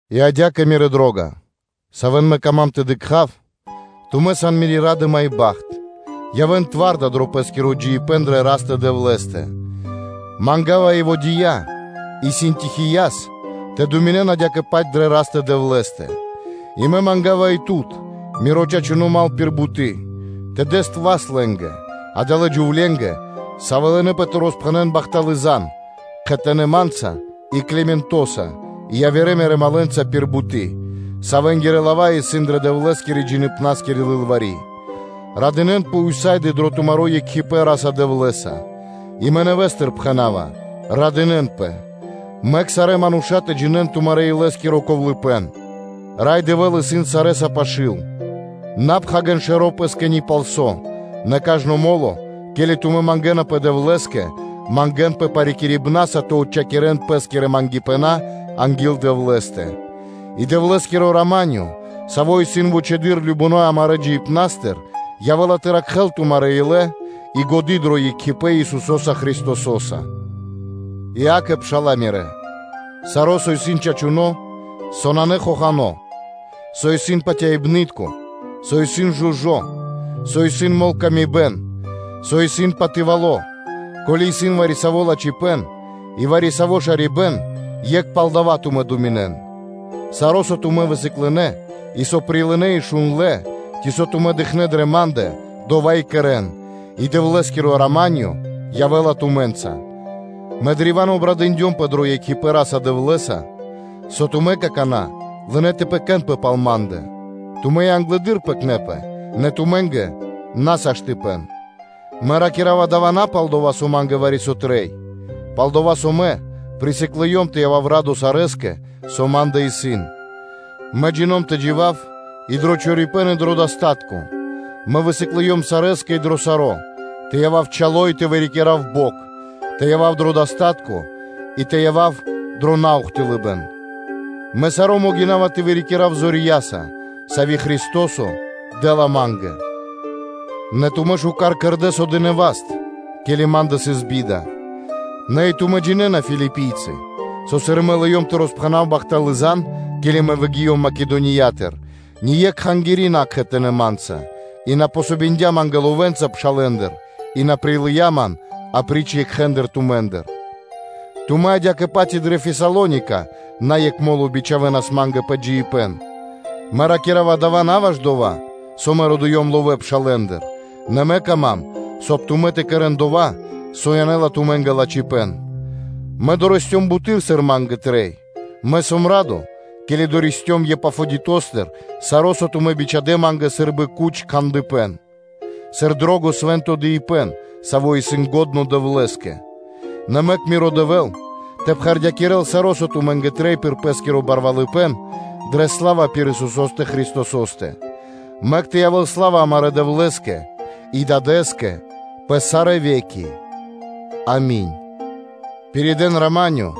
И адя́кэ, мирэ́ дро́га, савэ́н мэ кама́м тэ дыкха́в, тумэ́ сан мири́ ра́дыма и бахт, тэрдён зоралэ́с дро пэ́скиро джиибэ́н дрэ Растэ – Дэвлэ́стэ. Манга́ва Еводия, и Синтихияс тэ думинэн адя́кэ-паць дрэ Растэ-Дэвлэ́стэ; и мэ манга́ва и тут, миро чачуно́ мал пир буты́, тэ дэс васт лэ́нгэ, адалэ́ джувленгэ, савэ́ лынэпэ тэ роспхэнэ́н бахталы́ зан (звесь) кхэтанэ́ ма́нца, и Климентоса и явирэ мирэ́ малэнца пир буты́, савэнгирэ лава́ исын дрэ Дэвлэ́скирэ-джиибна́скири лылвари́. Радынэ́нпэ ўса́ды (сак) дро тумаро́ екхипэ́н Ра́са-Дэвлэ́са: и мэ нэвэ́стыр пхэна́ва: “Радынэ́нпэ.” Мэк сарэ́ мануша́ тэ джинэ́н тумарэ́-илэ́скиро ковлыпэн, Рай Дэвэ́л исын сарэ́са пашы́л. На пхагирэн шэро́ пэ́скэ ни пал со, нэ кажно мо́ло, ке́ли тумэ́ мангэ́напэ Дэвлэ́скэ, мангэ́нпэ парикирибнаса тэ отчхакирэн пэ́скирэ патерья (молитвы) анги́л Дэвлэ́стэ; и Дэвлэ́скиро рама́нё (миро), саво́ исын вучэды́р кажнонэ́ амарэ́ джиныбнастыр, явэ́ла тэ ракхэ́л тумарэ́ илэ и годы́ дро екхипэ́н Исусо́са Христосо́са. И акэ, пшала́лэ мирэ́, саро́, со исын чачуно́, со нанэ хохано́, со исын патяибны́тко, со исын жужо́, со исын мол тэ сыкавэ́л паты́в, со исын патывало, ко́ли исын вари-саво́ лачхипэ́н и вари-саво́ шарибэ́н, екх пал дава́ тумэ́ думинэн. Саро́, со тумэ́ высыклынэ, и со прилынэ́ и шундлэ́, ци со тумэ́ дыкхнэ́ дрэ ма́ндэ, дова́ и кэрэ́н, и Дэвлэ́скиро рама́нё (миро) явэ́ла тумэ́нца. Мэ древа́н обрадындёмпэ дро екхипэ́н Ра́са-Дэвлэ́са, со тумэ́ какана́ лынэ́ тэ пэкэнпэ (тэ заботисон) пал ма́ндэ, тумэ́ и англэды́р пэкнэпэ, нэ тумэ́нгэ на сыс саштыпэн (возможность/ваканцыя). Мэ ракира́ва дава́ на палдова́, со ма́нгэ вари-со трэй; нэ палдова́ со мэ присыклыём тэ явав радо сарэскэ, со ма́ндэ исын. Мэ джина́в тэ джива́в и дро чорорипэн и дро миштыпэ́н, мэ высыклыём сарэскэ и дро саро́, тэ явав чало и тэ вырикирав бокх, тэ явав дро миштыпэ́н и тэ явав дро наухтылыбэн. Мэ саро́ могина́ва тэ вырикирав зорья́са, сави́ Христо́со дэ́ла ма́нгэ. Нэ тумэ́ шука́р кэрдэ́, со дынэ́ васт, ке́ли ма́ндэ сыс би́да. Нэ и тумэ́ джинэ́на, Филипийцалэ, со сыр мэ лыём тэ роспхэнав бахталы́ зан (звесь), ке́ли мэ выгиём Македониятыр, ни екх кхангири́ на сыс кхэтанэ́ ма́нца и на помогиндя ма́нгэ ловэнца пшалэ́ндыр и на прилыя́ ман апри́ч екхэ тумэ́ндэ; Тумэ́ адя́кэ-паць и дрэ Фесалоника на екх мо́ло бичхавэнас ма́нгэ пэ джиибэ́н. Мэ ракира́ва дава́ на ваш дова́, со мэ родыём ловэ́ пшалэ́ндыр, нэ мэ кама́м, соб (кай) тумэ́ тэ кэрэ́н дова́, со янэ́ла тумэ́нгэ лачхипэ́н. Мэ дорэсцём буты́р, сыр ма́нгэ трэй, мэ сом радо, ке́ли дорэсцём Епафодитостыр саро́, со тумэ́ бичхадэ́ ма́нгэ сы́рбы гудло́ аромато, сыр дро́го свэ́нто дыибэ́н, саво́ исын лачхо́ Дэвлэ́скэ. Нэ мэк миро Дэвэ́л тэ пхэрдякирэл саро́, со тумэ́нгэ трэй пир Пэ́скиро барвалыпэ́н дрэ сла́ва пир Исусо́стэ Христосо́стэ. Мэк тэ явэ́л сла́ва амарэ́ Дэвлэ́скэ и Дадэ́скэ пэ сарэ́ ве́ки. Ами́нь. Павли́скиро Палатуно́ Пиридыибэ́н “Рама́нё”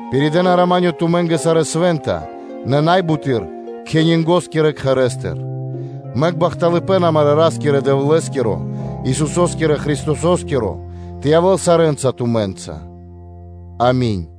Пиридэна “рама́нё” тумэ́нгэ сарэ́ свэ́нта, нэ най буты́р кхенингоскирэ (кесарёскирэ) кхэрэ́стыр. Мэк бахталыпэ́н амарэ́ Ра́скирэ-Дэвлэ́скиро, Исусо́скирэ Христосо́скиро тэ явэ́л сарэ́нца тумэ́нца. Ами́нь.